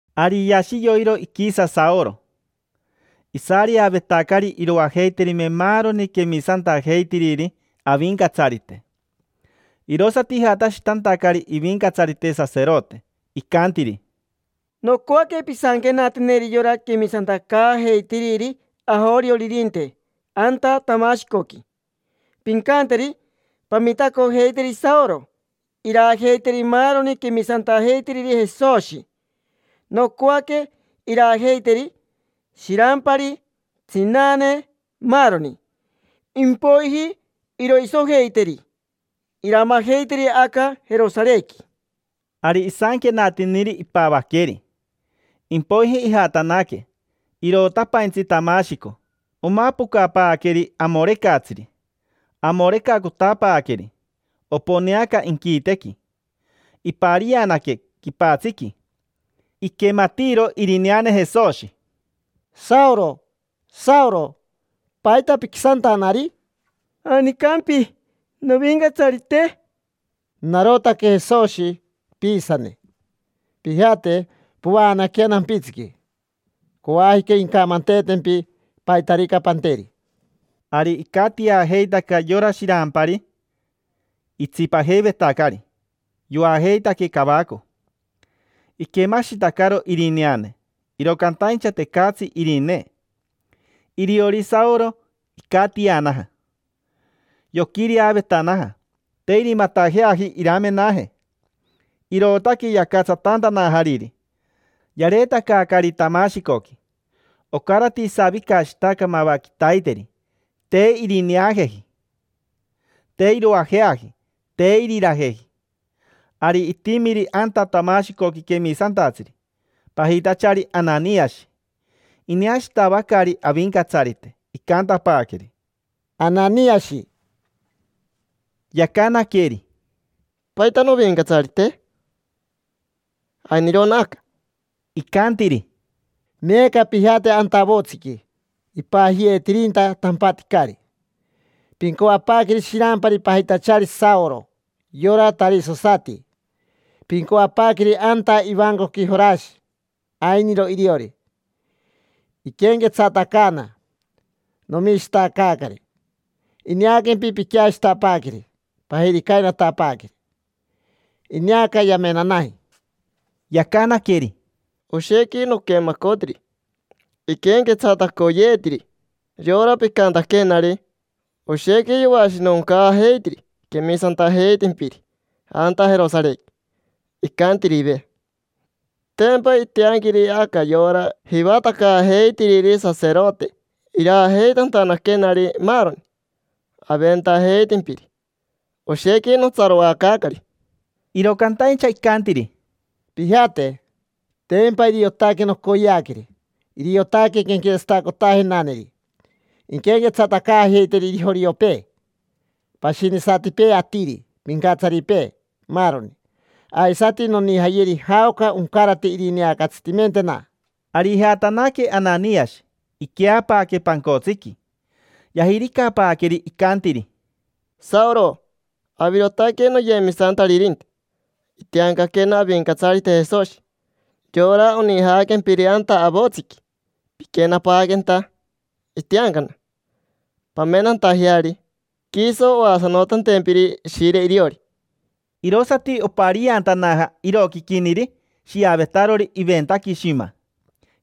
Ari yashi yoiro iquisa Saoro. Isareavetacari iroajeiterime maaroni quemisantajeitiriri Avincatsarite. Irosati ijatashitantacari ivincatsarite saserote, icantiri: —Nocoaque pisanquenateneri yora quemisantacaajeitiriri ajorioririnte anta Tamashicoqui, pincanteri: “Pamitacojeiteri Saoro iraajeiteri maaroni quemisantajeitiriri Jesoshi. Nocoaque iraajeiteri: shirampari, tsinane, maaroni. Impoiji iroisojeiteri, iramajeiteri aca Jerosarequi”. Ari isanquenatiniri, ipavaqueri. Impoiji ijatanaque, icantanaca, icantanaca: irotapaintsi Tamashico. Omapocapaaqueri amorecatsiri, amorecacotapaaqueri, morec: oponeaca inquitequi. Iparianaque quipatsiqui, tiricn, iquematiiro irineane Jesoshi: —Saoro, Saoro: ¿paita piquisantanari? —¿Janicampi, Novincatsarite? —Narotaque Jesoshi, piisane. Pijate, povaanaquea nampitsiqui. Coajica incamanteetempi paitarica panteri. Ari icatiajeitaca yora shirampari itsipajeivetacari, yoajeitaque cavaco. Iquemashitacaro irineane, iro cantaincha tecatsi irinee. Iriori Saoro, icatianaja. Yoquireavetanaja, te irimatajeaji iramenaje, irootaque yacatsatantanajariri, yareetacaacari Tamashicoqui. Ocarati isavicashitaca mava quitaiteri. Te irineajeji, te iroajeaji, te irirajeji. Ari itimiri anta Tamashicoqui quemisantatsiri, pajitachari Ananiashi. Ineashitavacari Avincatsarite, icantapaaqueri: —Ananiashi. Yacanaqueri: —¿Paita, Novincatsarite? Ainirona aca. Icantiri: —Meeca pijate anta avotsiqui ipajiyeetirinta: “Tampaticari”. Pincoapaaqueri shirampari pajitachari Saoro, yora tarisosati. Pincoapaaqueri anta ivancoqui Jorashi. Ainiro iriori, iquenquetsatacaana. Nomishitacaacari, ineaquempi piqueashitapaaqueri, pajiricainatapaaqueri; ineaca yamenanaji. Yacanaqueri: —Oshequi noquemacotiri, iquenquetsatacoyeetiri yora picantaquenari. Oshequi yoashinoncaajeitiri quemisantajeitimpiri anta Jerosarequi, icantirive. Tempa itianquiri aca yora jivatacaajeitiriri saserote iraajeitantanaquenari, maaroni aventajeitimpiri. Oshequi notsaroacaacari. Iro cantaincha icantiri: —Pijate. Tempa iriotaque nocoyeaqueri. Iriotaque quenquetsatacotajenaneri. Inquenquetsatacaajeiteri joriopee, pashinisatipee atiri, pincatsaripee, maaroni. Aisati nonijayeri jaoca oncarate irineacatsitimentena. Ari ijatanaque Ananiashi, iqueapaaque pancotsiqui. Yajiricapaaqueri, icantiri: —Saoro, avirotaque noyemisantaririnte. Itiancaquena Avincatsarite Jesoshi, yora onijaaquempiri anta avotsiqui piquenapaaquenta. Itiancana pamenantajeari, quiso oasanotantempiri Ishire iriori. Irosati opariantanaja iroquiquiniri shiavetarori iventaqui shima,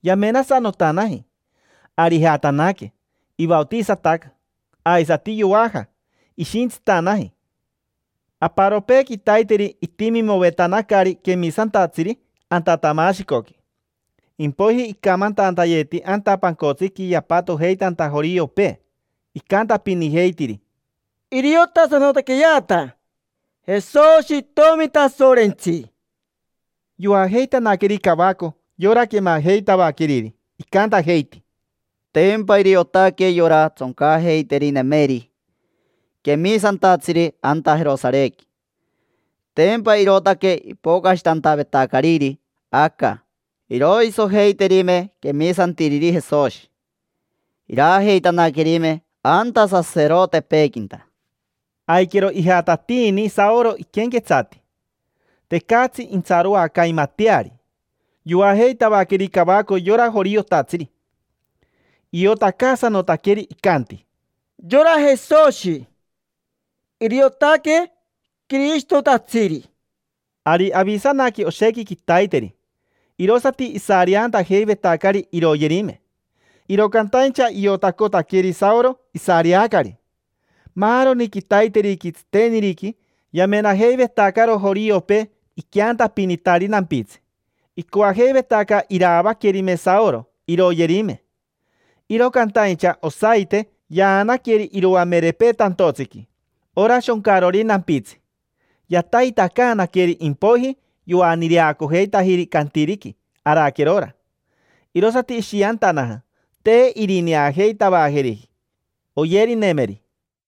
yamenasanotanaji. Ari ijatanaque, ivaotisataca. Aisati yoaja, ishintsitanaji. Aparopee quitaiteri itimimovetanacari quemisantatsiri anta Tamashicoqui. Impoiji icamantantayeti anta pancotsiqui yapatojeitanta joriopee. Icantapinijeitiri: —Iriotasanotaqueyeata Jesoshi Itomi Tasorentsi. Yoajeitanaqueri cavaco yora quemajeitavaqueriri. Icantajeiti: —Tempa iriotaque yora tsoncajeiterinemeri quemisantatsiri anta Jerosarequi. Tempa irootaque ipocashitantavetacariri aca iroisojeiterime quemisantiriri Jesoshi, iraajeitanaquerime anta saserotepeequinta. Aiquero ijatatiini Saoro iquenquetsati, tecatsi intsaroacaimateari. Yoajeitavaqueri cavaco yora joriotatsiri. Iotacaasanotaqueri, icanti: —Yora Jesoshi, iriotaque Quirishitotatsiri. Ari avisanaque oshequi quitaiteri, irosati isareantajeivetacari iroyerime. Iro cantaincha iotacotaqueri Saoro isareacari. Maaroni quitaiteriqui, tsiteniriqui, yamenajeivetacaro joriopee iqueantapinitari nampitsi, icoajeivetaca iraavaquerime Saoro, iroyerime. Iro cantaincha, osaite yaanaqueri iroamerepee tantotsiqui, ora shoncarori nampitsi; yataitacaanaqueri, impoiji yoaniireacojeitajiri cantiriqui araquerora. Irosati ishiantanaja, te irineajeitavajeriji oyerinemeri.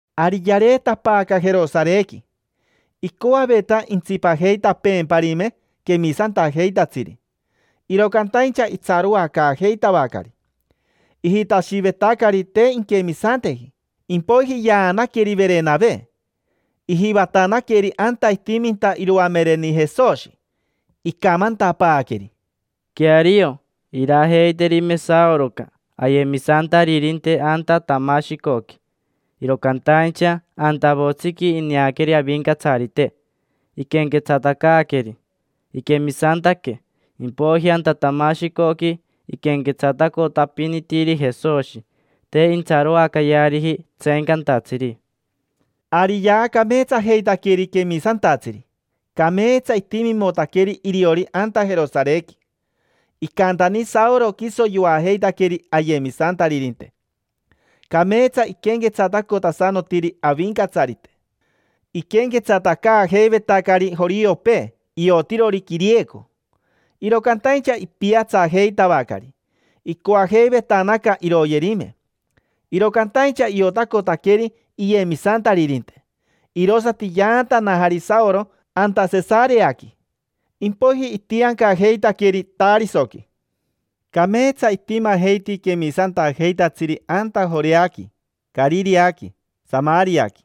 Ari yareetapaaca Jerosarequi. Icoaveta intsipajeitapeemparime quemisantajeitatsiri, iro cantaincha itsaroacaajeitavacari. Ijitashivetacari te inquemisanteji. Impoiji yaanaqueri Verenave, ijivatanaqueri anta itiminta iroamereni Jesoshi. Icamantapaaqueri: —Queario, iraajeiterime Saoroca ayemisantaririnte anta Tamashicoqui, iro cantaincha anta avotsiqui ineaqueri Avincatsarite, iquenquetsatacaaqueri. Iquemisantaque, impoiji anta Tamashicoqui iquenquetsatacotapinitiri Jesoshi, te intsaroacayeariji tseencantatsiri. Ari yaacameetsajeitaqueri quemisantatsiri, cameetsa itimimotaqueri iriori anta Jerosarequi. Icantani Saoro, quiso yoajeitaqueri ayemisantaririnte. Cameetsa iquenquetsatacotasanotiri Avincatsarite. Iquenquetsatacaajeivetacari joriopee iotirori quirieco, iro cantaincha ipiatsajeitavacari; icoajeivetanaca iroyerime, iro cantaincha iotacotaqueri iyemisantaririnte, irosati yaantanajari Saoro anta Sesareaqui. Impoiji itiancajeitaqueri Tarisoqui. Cameetsa itimajeiti quemisantajeitatsiri anta Joreaqui, Carireaqui, Samariaqui.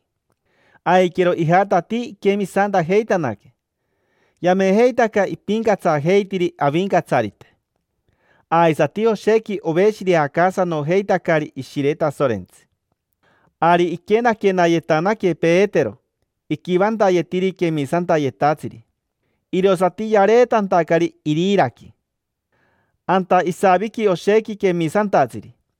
Aiquero ijatatii iquemisantajeitanaque. Yamejeitaca ipincatsajeitiri Avincatsarite. Aisati oshequi oveshireacaasanojeitacari Ishire Tasorentsi. Ari iquenaquenayetanaque Petero iquivantayetiri quemisantayetatsiri, irosati yareetantacari Iriraqui. Anta isaviqui oshequi quemisantatsiri.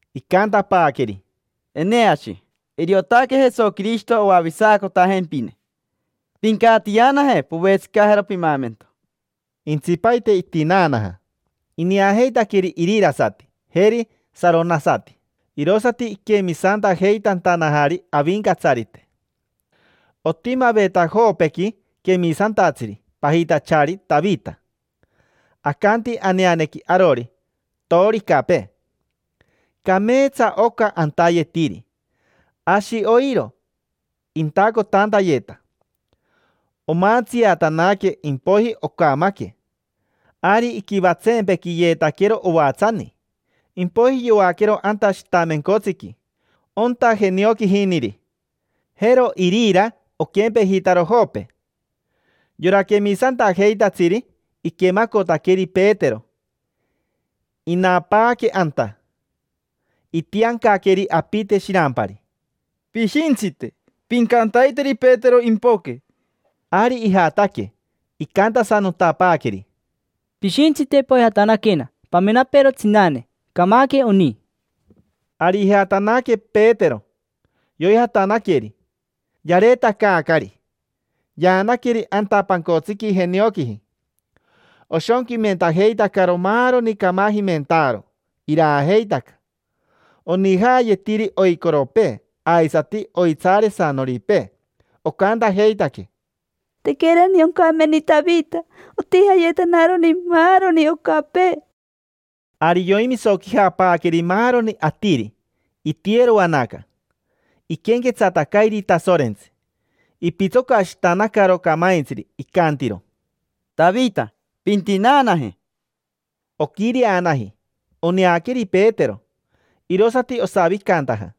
Icantapaaqueri: —Eneashi, iriotaque Jesoquirishito oavisacotajempine. Pincatianaje, povetsicajero pimaamento. Jentsipaite itinaanaja. Ineajeitaqueri irirasati, jeri saronasati; irosati iquemisantajeitantanajari Avincatsarite. Otimaveta Jopequi quemisantatsiri pajitachari Tavita. Acanti aneanequi arori: Maniro. Cameetsa oca antayetiri: ashi oiro intacotantayeta. Omantsiatanaque, impoiji ocamaque, torein. Ari iquivatsempequiyeetaquero ovatsani, impoiji yoaquero anta shitamencotsiqui, onta jenioquijiniri. Jero Irira oquempejitaro Jope. Yora quemisantajeitatsiri, iquemacotaqueri Petero, inapaaque anta. Itiancaqueri apite shirampari: —Pishintsite, pincantaiteri Petero impoque. Ari ijataque, icantasanotapaaqueri: —Pishintsite poijatanaquena pamenapeero tsinane, camaque oni. Ari ijatanaque Petero, yoijatanaqueri. Yareetacaacari, yaanaqueri anta pancotsiqui jenioquiji. Oshonquimentajeitacaro maaroni camajimentaaro, iraajeitaca. Onijaayetiri oicoropee, aisati oitsaaresanoripee. Ocantajeitaque: —Tequerani oncameni Tavita, otijayetanaroni maaroni ocapee. Ari yoimisoquijapaaqueri maaroni atiri. Itiyeroanaca, iquenquetsatacairi Tasorentsi. Ipitsocashitanacaro camaintsiri, icantiro: —Tavita, pintinaanaje. Oquireanaji, oneaqueri Petero, irosati osavicantaja.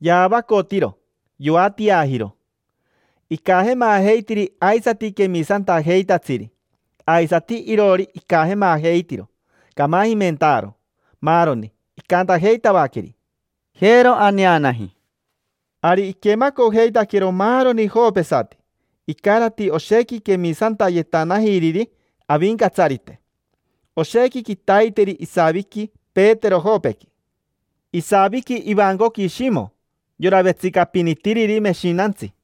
Yaavacotiro, yoatiajiro. Icajemajeitiri aisati quemisantajeitatsiri, aisati iroori icajemajeitiro camajimentaaro, maaroni. Icantajeitavaqueri: —Jero, aneanaji. Ari iquemacojeitaquero maaroni jopesati. Icarati oshequi quemisantayetanajiriri Avincatsarite. Oshequi quitaiteri isaviqui Petero Jopequi. Isaviqui ivancoqui Shimo, yora vetsicapinitiriri meshinantsi.